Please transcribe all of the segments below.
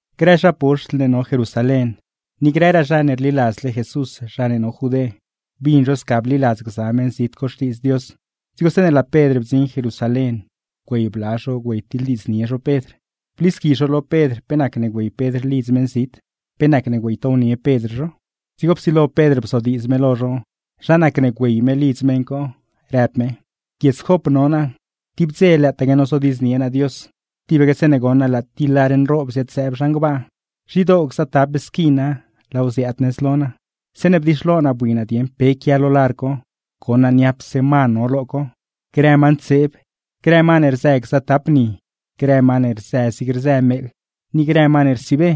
Grë zha poxtl ne no Jerusalén, ni grëraa zha ne rliladzle Jesús zha ne no Judé, bin zho sca bliladz gza meṉzit co Xtiidz Dios. Dzigo zeeṉe laa Pedr bdziṉ Jerusalén güey bla zho güeytiḻdiidznie zho Pedr, blisqui zho lo Pedr pe nacne güey Pedr lidz meṉzit, pe nacne güeytownie Pedr zho. Dzigo psilo Pedr bzodiidz me lo zho zha nacne güey me lidz meṉ co, rëb me: ―Guiedz Jop no naa, tib dze lëëtaque nozodiidznie naa Dios, tibaque zeeṉe goṉ naa laa ti lar nroob ziad-zëëb zhan gbaa, nzhidoo gzatap squina laaw ziaad nëz lo naa. Zeeṉe bdixlo naa bui naa dieṉ pe quia lo lar co, goṉ naa niapse ma no lo co, grë ma ntseeb, grë ma ne rzë gzatap ni, grë ma ne rzë zig rzë meeḻ, ni grë ma ne rsiibe.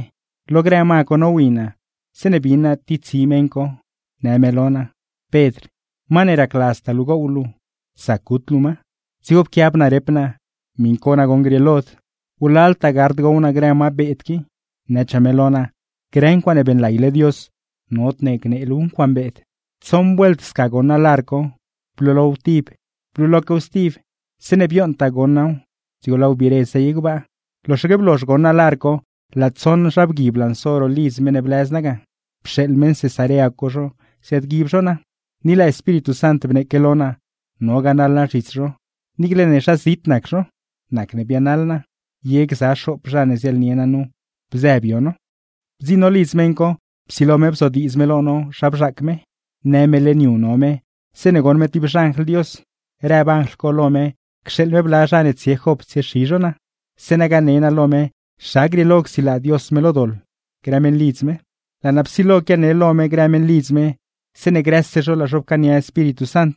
Lo grë ma co nowi naa, zeeṉe bin naa ti tsi meṉ co, në lo naa: “Pedr, ma ne racladztaa luu gow luu, zac gut luu ma.” Dzigo pquiab naa rep naa: “Miṉ cogaa nagoṉ grieelod, wlaltaa gard gow naa grë ma beed qui.” Nëchaa me lo naa: “Grë ncuaaṉe beeṉlayle Dios, nodne gnee luuw ncuaaṉ beed.” ’Tsoṉ vuelt sca goṉ naa lar co. Blulow tib, bluloquew stib, zeeṉe bioṉtaa goṉ naaw dzigo laaw biire zey gbaa. ’Loxaque blozh goṉ naa lar co, laa tsoṉ zha bgui blanso ro lidz meṉ ne blëz naa ga, pxeeḻ meṉ Cesarea co zho ziaadguib zho naa. Ni laa Espíritu Sant bneeque lo naa, no ganaḻ naa zhits zho, niicle ne zhazit nac zho; nacne bianaḻ naa. Ye gza xoop zha ne ziaḻnie naa nu bzë bio no. ’Bdziṉ no lidz meṉ co, psilo me bzodiidz me lo no zha bzhaac me, në me leṉ yu no me, zeeṉe goṉ me ti xanjl Dios, rëb anjl co lo me cxeeḻ me bla zha ne tsie Jop tsiexi zho naa zeeṉa gane naa lo me zha grieelo csilaa Dios me lo doḻ grë meṉlidz me. ’Laa naa psilo quiane lo me grë meṉlidz me, zeeṉe grëse zho laa zho pcaania Espíritu Sant,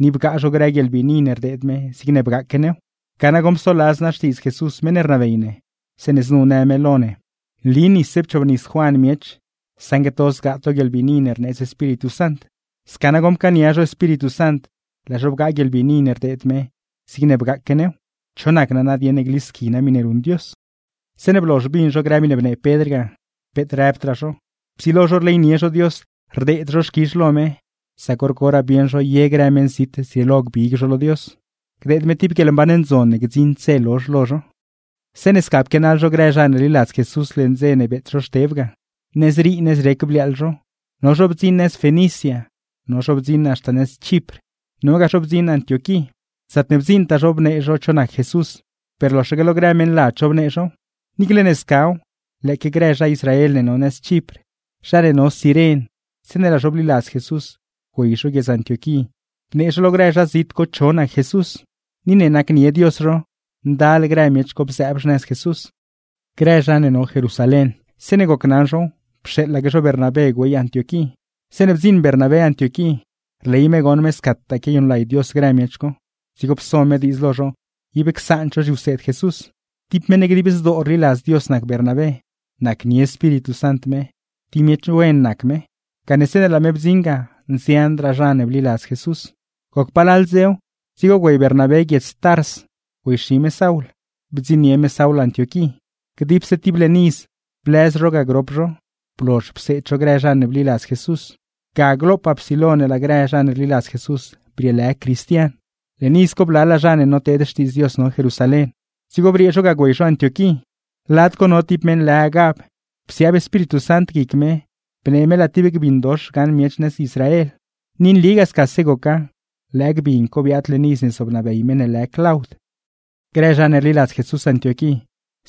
ni bgaa zho grë guieḻbiini ne rdeed me zigne bgaaque new. Ga nagoṉ psoladz naa xtiidz Jesús meṉ ne rnabey ne, zeeṉe znu në me lo ne: “Nli nisse pchoobnis Juan miech, saṉgue to zgaa to guieḻbiini ne rneedz Espíritu Sant.” Sca nagoṉ pcaania zho Espíritu Sant, laa zho bgaa guieḻbiini ne rdeed me zigne bgaaque new. ¿Cho nac naa nadieṉ ne glisqui naa miṉe ruṉ Dios? Zeeṉe blozh bin zho grë miṉe bnee Pedr ga, peet rëbdraa zho. Psilo zho rleynie zho Dios, rdeed zho xquizh lo me; sac hor coraa bieṉ zho ye grë meṉzit zrieelo gbig zho lo Dios, gdeed me ti guieḻmban ndzon ne gdziṉd dze lozh lo zho. Zeeṉe sca pquianaḻ zho grë zha ne rliladz Jesús leṉ dze ne beet zho Xteb ga, nëzrii nëzrec bliaaḻ zho. No zho bdziṉ haxta Fenicia, no zho bdziṉ Chipr, nogaa zho bdziṉ nëz Antioquí. Zaatne bdziiṉtaa zho bnee zho cho nac Jesús, per loxaque lo grë meṉladz zho bnee zhow. Niicle ne scaw, lëëque grë zha Israel ne no Chipr, zha ne no Ciren, zeeṉe laa zho bliladz Jesús güey zho guiedz Antioquí, bnee zho lo grë zha zit co cho nac Jesús. Ni ne nacnie Dios zho, ndal grë miech co bzëëb xnëz Jesús. Grë zha ne no Jerusalén, zeeṉe gocnaṉ zhow pxeeḻaque zho Bernabé güey Antioquí. Zeeṉe bdziṉ Bernabé Antioquí, rley me goṉ me scataa quiayuṉlay Dios grë miech co; dzigo pso me diidz lo zho ib csaand zho zhiwseed Jesús. Ti meṉ dib zdoo rliladz Dios nac Bernabé, nacnie Espíritu Sant me, ti miech wen nac me; gane zeeṉe laa me bdziṉ ga nzianraa zha ne bliladz Jesús. Goc palal dzew, dzigo güey Bernabé guiedz Tars güeyxi me Saul, bdziṉnie me Saul Antioquí. Dipse ti leṉ iz blëz zho ga grop zho, blozh pseed zho grë zha ne bliladz Jesús. Ga glopaa psilo ne laa grë zha ne rliladz Jesús brieelë CRISTIAN. Leṉ iz co blalaa zha ne noteed xtiidz Dios no Jerusalén. Dzigo briee zho ga güey zho Antioquí. Lad co no tib meṉ lë Agab, psiaab Espíritu Sant guic me bnee me laa ti gbin dox gaṉ miech nëz Israel. (Ni nligaa scase goca, lëë gbin co biaad leṉ iz ne zobnabey meṉ ne lë Claud.) Grë zha ne rliladz Jesús Antioquí,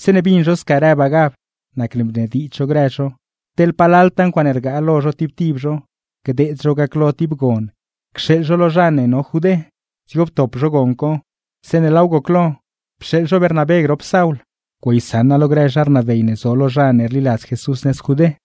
zeeṉe bin zho sca rëb Agab, nacne bnediidz zho grë zho, teḻ palaltaa ncuaaṉe rgaa lo zho tib tib zho gdeed zhow gaclo ti gon cxeeḻ zho lo zha Judé. Dzigo ptop zho gon co, zeeṉe laaw goclo, pxeeḻ zho Bernabé grop Saul güeysaṉa lo grë zha rnabey ne zo lo zha ne rliladz Jesús nëz Judé.